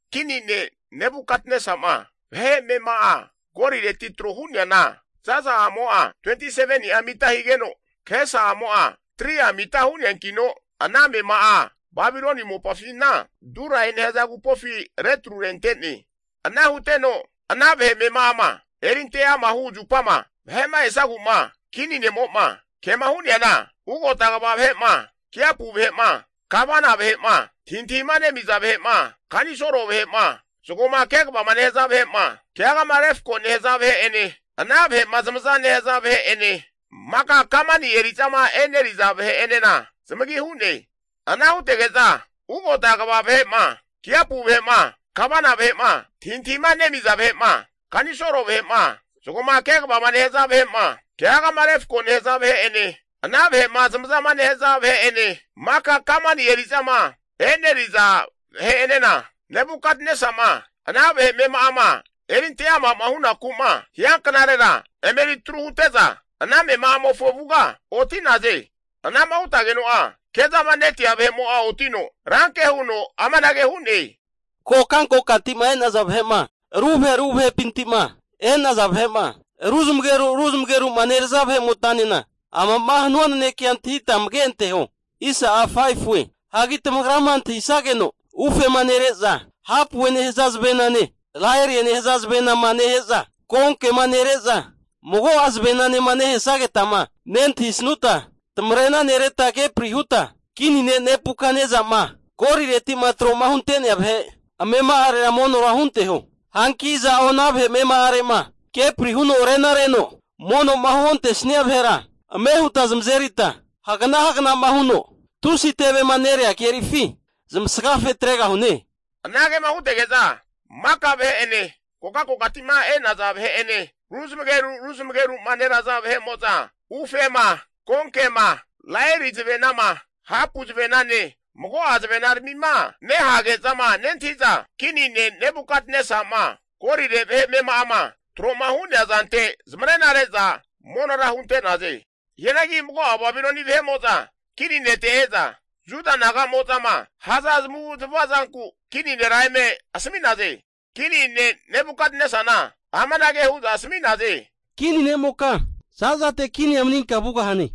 Kini ne' Nebukatnesa'ma vahe amema'a golireti tro hu'neana zaza'amo'a 27ni'a mita higeno, kahesa'amo'a 3'a mita hu'neankino ana amema'a Babiloni mopafina Durae nehaza agupofi retru rente'ne. Ana huteno ana vahe amema'ama erinte ama hu zupama vahe'ma esazegu'ma kini ne'mo'ma kema hu'neana, ugota kva vahe'ma, kiapu vahe'ma, gavana vahe'ma, antahintahima nemiza vahe'ma, kanisolo vahe'ma, zagoma kegavama nehaza vahe'ma, keagama refko nehaza vahe'ene ana vahe'ma zamaza nehaza vahe'ene maka kamani eri'zama eneriza vahe'enena zamagi hu'ne. Ana hutege'za ugota kva vahe'ma, kiapu vahe'ma, gavana vahe'ma, antahintahima nemiza vahe'ma, kanisolo vahe'ma, zagoma kegavama nehaza vahe'ma, keagama refko nehaza vahe'ene ana vahe'ma zamazama nehaza vahe'ene maka kamani eri'zama eneriza vahe'enena, Nebukatnesama ana vahe amema'ama erinte ama'ma hunaku'ma hianknarera emeri atru hute'za ana amema'amofo avuga oti'naze. Anama hutazageno'a kezamanetia vahe'mo'a otino, ranke huno amanage hu'ne. Kokankokati'ma e'naza vahe'ma, ru vahe ru vahepinti'ma e'naza vahe'ma ruzamageru ruzamageru'ma neraza vahe'motanena amama hanua nanekea antahita amage anteho. Hagi tamagrama antahisageno, ufema nere'za, hapue nehaza zavenane laerie nehaza zavenama nehe'za, konkema nere'za, mago'a zavenanema nehesagetama nentahisanuta, tamarena nereta kepri huta, kini ne' Nebukatnesa'ma golireti'ma tro'ma hunte'nea vahe amema'arera monora hunteho. Hanki iza'o ana vahe amema'are'ma kepri huno renareno mono'ma huontesnia vahera, ame huta zamazerita hagana haganama huno tusi tevema nerea kerifi zamasgafe atregahune. Anagema hutege'za maka vahe'ene, kokankokati'ma e'naza vahe'ene, ru zamageru ru zamageru'ma neraza vahe'mo'za ufema, konkema, laeri zavenama, hapu zavenane mago'a zavenaramima nehage'zama nentahi'za kini ne' Nebukatnesa'ma golire vahe amema'ama tro'ma hu'nea zante zamarena re'za monora hunte'naze. Hianagi mago'a Babiloni vahe'mo'za kini nete e'za, Juda naga'mozama haza zamavu'zamava zanku kini nera eme asami'naze. Kini ne' Nebukatnesana amanage hu'za asami'naze. Kini ne'moka, za'zate kinia maninka vugahane!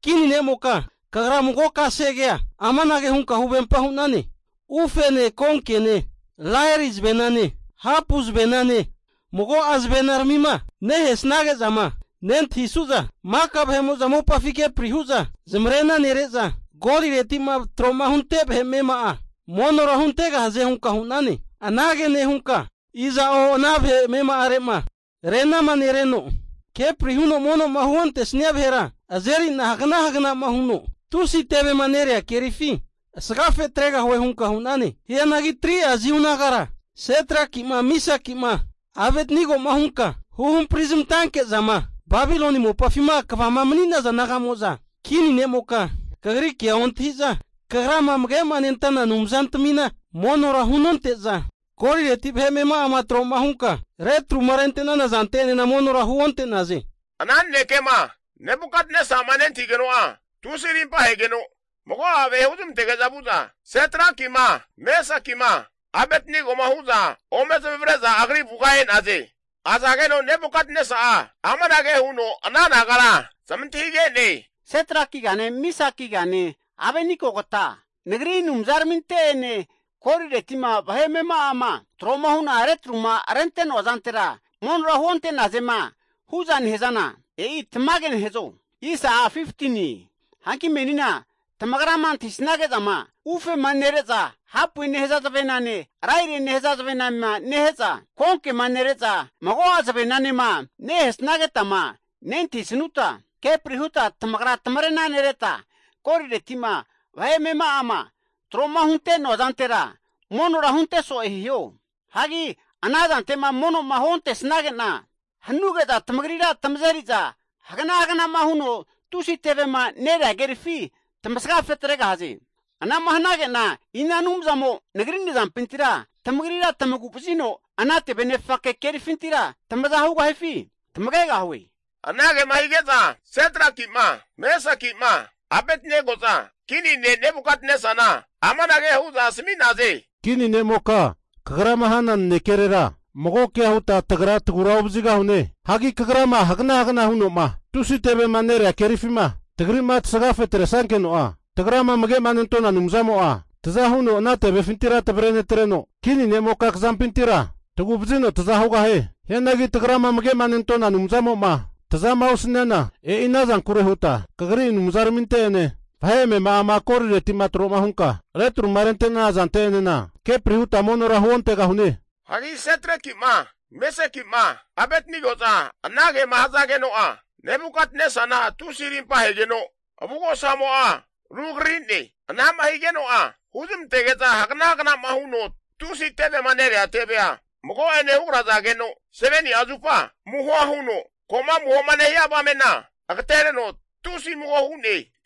Kini nemoka kagra mago kasegea amanage hunka huvempa hu'nane. Ufene, konkene, laeri zavenane, hapu zavenane mago'a zavenaramima nehesnage'zama nentahisu'za, maka vahe'mo'za mopafi kepri hu'za zamarena nere'za, golireti'ma tro'ma hunte vahe amema'a monora huntegahaze hunka hu'nane. Anage nehunka iza'o ana vahe amema'are'ma renama nereno, kepri huno mono'ma huontesnia vahera azeri'na hagana haganama huno tusi tevema nerea kerifi asagafe atregahue hunka hu'nane. Hianagi 3'a Jiu nagara, Setrakima, Misakima, Abetnegoma hunka huhampari zamantanke'zama, Babiloni mopafima kvama mani'naza naga'mo'za, kini nemoka kagri kea ontahi'za, kagrama amage'ma nentana anumzantamina monora hunonte'za, golireti vahe amema'ama tro'ma hunka retruma rente'nana zante'enena monora huonte'naze. Ana nanekema Nebukatnesa'ma nentahigeno'a tusi arimpa ahegeno, mago'a vahe huzmantege'za vu'za, Setrakima, Mesakima, Abetnegoma hu'za ome zamavare'za agri avuga e'naze. Azageno Nebukatnesa'a amanage huno ana nagara zamantahige'ne. Setrakigane, Mesakigane Abetnegogata, nagri anumzaraminte'ene, golireti'ma vahe amema'ama tro'ma hu'na retruma rente'noa zantera monora huonte'nazema hu'za nehazana, e'i tamage nehazo? Hanki menina tamagrama antahisanage'zama ufema nere'za hapue nehaza zavenane, lairie nehaza zavenama nehe'za, konkema nere'za, mago'a zavenanema nehesnagetama nentahisanuta, kepri huta tamagra tamarena nereta, golireti'ma vahe amema'ama tro'ma hunte'noa zantera monora hunte so'e hiho. Hagi ana zante'ma mono'ma huontesnage'na, hanuge'za tamagrira tamazeri'za hagana hagana'ma huno tusi tevema nerea kerifi tamasga fetregahaze. Anama hanage'na ina anumzamo nagri nazampintira tamagrira tamagu vazino ana tevenefake kerifintira tamaza hugahifi tamagegahue? Anagema hige'za Setraki'ma, Mesaki'ma, Abetnego'za kini ne' Nebukatnesana amanage hu'za asami'naze. Kini ne'moka kagrama hana nanekerera mago kea huta tagra tagura ovazigahune. Hagi kagrama hagana hagana'ma huno'ma tusi tevema nerea kerifima tagri'ma tasagafe atresnankeno'a, tagrama amage'ma nentona Anumzamo'a taza huno ana tevefintira tavrenetreno, kini ne'moka kazampintira tagu'vazino taza hugahie. Hianagi tagrama amage'ma nentona Anumzamo'ma tazama osaniana, e'i ana zankure huta kagri anumzaraminte'ene vahe amema'ama golireti'ma tro'ma hunka retruma rente'nana zante'enena kepri huta monora huontegahune. Hagi Setraki'ma, Mesaki'ma, Abetnego'za anagema hazageno'a, Nebukatnesana tusi arimpa ahegeno avugosamo'a rugrari'ne. Anama higeno'a huzmantege'za hagana hagana'ma huno tusi tevema nerea tevea mago'ene hugrazageno 7'ni'a zupa amuhoa huno, ko'ma amuhoma nehia avamena agatereno tusi amuho hu'ne.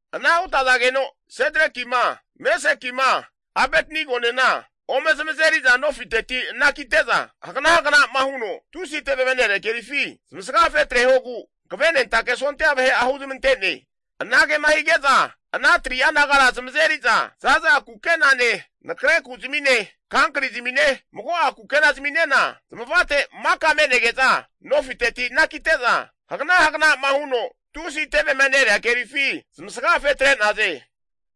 Ana hutazageno Setrakima, Mesakima, Abetnegonena ome zamazeriza nofiteti anakite'za, hagana hagana'ma huno tusi tevema nerea kerifi zamasgafe atrehogu hankavenentake sondia vahe'a huzmante'ne. Anagema hige'za ana 3'a nagara zamazeri'za, zaza kukenane, nakre kuzmine, kankri zamine mago'a kukenazminena zamavate maka me'nege'za nofiteti anakite'za, hagana hagana'ma huno tusi tevema nerea kerifi zamasgafe tre'naze.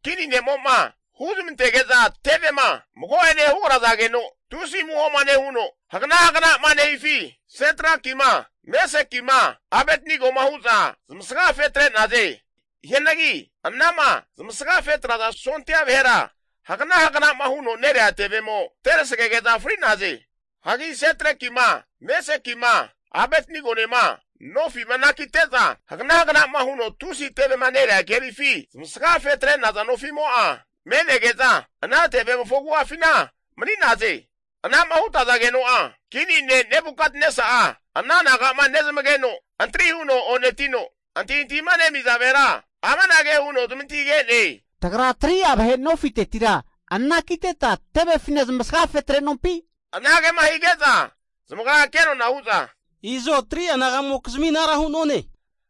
Kini nemo'ma huzmantege'za tevema mago'ene hugrazageno tusi amuhoma nehuno hagana hagana'ma nehifi, Setrakima Mesakima Abetnegoma hu'za zamasga fetre'naze. Hianagi anama zamasga fetraza sondia vahera hagana hagana'ma huno nerea tevemo terasagege'za fri'naze. Hagi Setrakima, Mesakima, Abetnegonema nofi'ma anakite'za hagana hagana'ma huno tusi tevema nerea kerifi zamasgafe atre'naza nofimo'a, me'nege'za ana tevemofo agu'afina mani'naze. Anama hutazageno'a, kini ne' Nebukatnesa'a ana naga'ma nezamageno, antri huno o'netino antahintahima nemiza vahera amanage huno zamantahige'ne. Tagra 3'a vahe nofitetira anakiteta tevefina zamasga fetre'nompi? Anagema hige'za zamagra kenona hu'za, i'zo 3'a naga'mokizmi anara hu'none.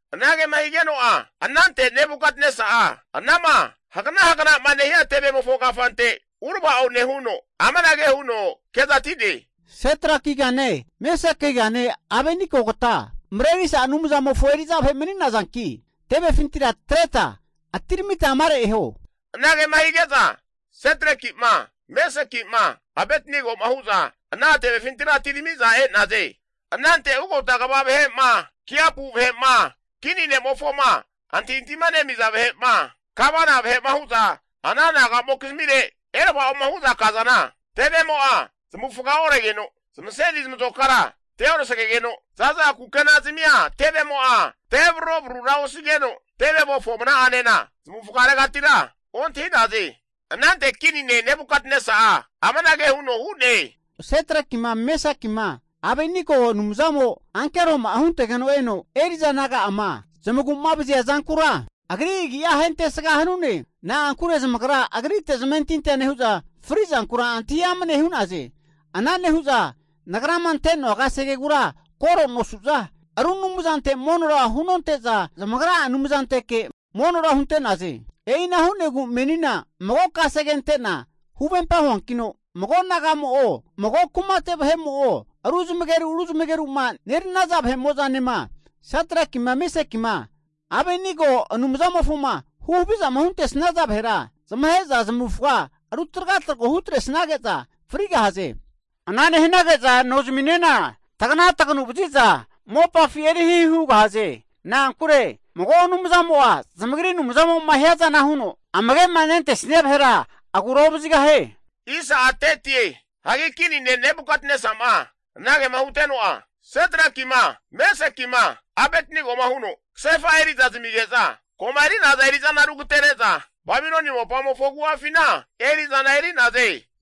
Anagema higeno'a anante Nebukatnesa'a anama hagana hagana'ma nehia tevemofo kafante urava'o nehuno, amanage huno kezati'ne. Setrakigane Mesakigane Abetnegogata, Marerisa Anumzamofo eri'za vahe mani'nazanki, tevefintira atreta atiramita amare eho. Anagema hige'za Setraki'ma Mesaki'ma Abetnego'ma hu'za ana tevefintira atirami'za e'naze. Anante ugota kva vahe'ma, kiapu vahe'ma, kini ne'mofoma antahintahima nemiza vahe'ma, gavana vahe'ma hu'za ana naga'mokizmire erava'oma hu'za kazana, tevemo'a zamavufaga oregeno, zamaseni zamazokara teorasagegeno, zaza kukena zamia tevemo'a tevararo'vararura osigeno, tevemofo mna'anena zamavufaga regatira ontahi'naze! Anante kini ne' Nebukatnesa'a amanage huno hu'ne. Setrakima, Mesakima, Abetnegokizmi Anumzamo'a ankero'ama huntegeno eno eri'za naga'ama zamagu'ma vazia zankura, Agri agia ahentesga hanune. Na'ankure zamagra agrite zamentintia nehu'za, fri'zankura antahi amane hu'naze. Ana nehu'za nagrama ante'noa kasegegura koro nosu'za, ru anumzantera monora hunonte'za, zamagra'a Anumzanteke monora hunte'naze. E'ina hu'negu menina mago kasege ante'na huvempa huankino, mago nagamo'o, mago kumate vahe'mo'o, ru zamageru ru zamageru'ma neranaza vahemo'zanema, Setrakima, Mesakima, Abetnego Anumzamofoma huhavizama huntesnaza vahera, zamahe'za zamavufaga rutragatragu hutresnage'za frigahaze. Ana nehanage'za nozaminena tagana taganu vazi'za mopafi eri hihi hugahaze. Na'ankure mago anumzamo'a zamagri Anumzamo'ma hiazana huno, amage'ma nentesnia vahera agura ovazigahie. Hagi kini ne' Nebukatnesa'ma anagema huteno'a, Setrakima, Mesakima, Abetnegoma huno kasefa eri'za zamige'za, koma eri'naza eri'zana rugatere'za, Babiloni mopamofo agu'afina eri'zana eri'naze.